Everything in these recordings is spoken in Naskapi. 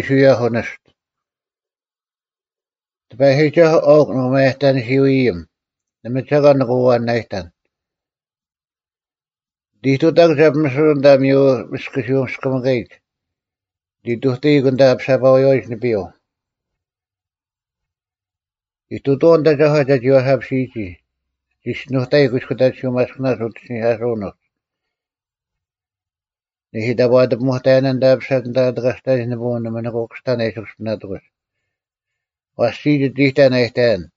Year A; Easter-4 Year A, B, C; Proper-11 Year B) 1ᑎᐸᔨᒋᒐᓱᐤ ᐊᐅᒄ ᓂᒪᔭᑕᓂᓯᐅ-ᐃᔨᒻ; ᓇᒪ ᒐᒂᓐ ᓂᑭ ᐛᐛᓇᔨᑕᓐ᙮ 2ᓂᑦ ᐃᑐᑕᒄ ᒐ ᐱᒥᓯᓄᐅᒡ ᐊᓐᑕ ᐊ ᒥᔪ ᒥᔅᑯᓯᐅᔅᑭᒥᑲᔨᒡ: ᓂᑦ ᐃᑐᑕᐃᒄ ᐊᓐᑕ ᐊ ᐊᐱᓴᐸᐎᔪᐛᔨᒡ ᓂᐱᔪᐤ᙮ 3ᐃᑐᑐᐛᐤ ᓂᑦ ᐊᒐᒂ ᒐ ᒋᐛ ᓴᐱᓯᔨᒋ: ᓂ ᒋᔅᒋᓄᑕᐃᒄ ᑯᐃᔅᑯᑕᑎᓯᐅ ᒪᔅᑭᓇᒡ ᐅᑦ ᐃᓯᓂᐧᑲᓱᐅᓐ ᐅᒡ᙮ 4ᓂᐦᐃ ᑕᑈ, ᐊᑎ ᐱᒧᑕᔭᓇ ᐊᓐᑕ ᐊ ᐱᓴᒡ ᐊᓐᑕ ᐊ ᑎᑲᔅᑕᑎᒡ ᓂᐳᐅᓐ, ᓇᒪ ᓂᑭ ᑯᔅᑕᓐ ᐊ ᐃᓯ ᑯᔅᐱᓇᑎᒂᒡ; ᐛᔅ ᒋᔾ ᒋᑦ ᐃᑕᓐ ᐊ ᑕᔭᓐ: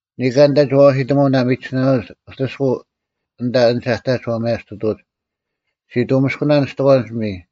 ᓂᑲᓐ ᐊᓐᑕ ᒋ ᐛᐛᓯᑕᒧᐅᓐ ᐊ ᒥᒋᓱᓇᓄᐎᒡ ᐅᑎᔅᑯᐤ, ᐊᓐᑕ ᐊᓐᒡ ᐊᑕᒡ ᐛ ᒪᔭᒋᑐᑕᐎᒡ: ᔅᒋ ᑐᒥᔅᑯᓇᓐ ᓂᔅᑎᒂᓐ ᐱᒥᔾ;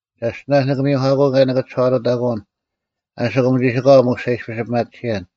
ᒐᔅᑎᓇᔅ ᓂᑭ ᒥᔪᐧᑲᑯᐅᓐ ᑭᔭ ᓂᑭ ᒋᓴᐛᑐᑕᑯᐅᓐ ᐊᓯᑯᒻ ᒋᓯᑲᐛ ᒧᔅ ᒐ ᐃᔅᐱᔅ ᐱᒪᑎᓯᔭᓐ: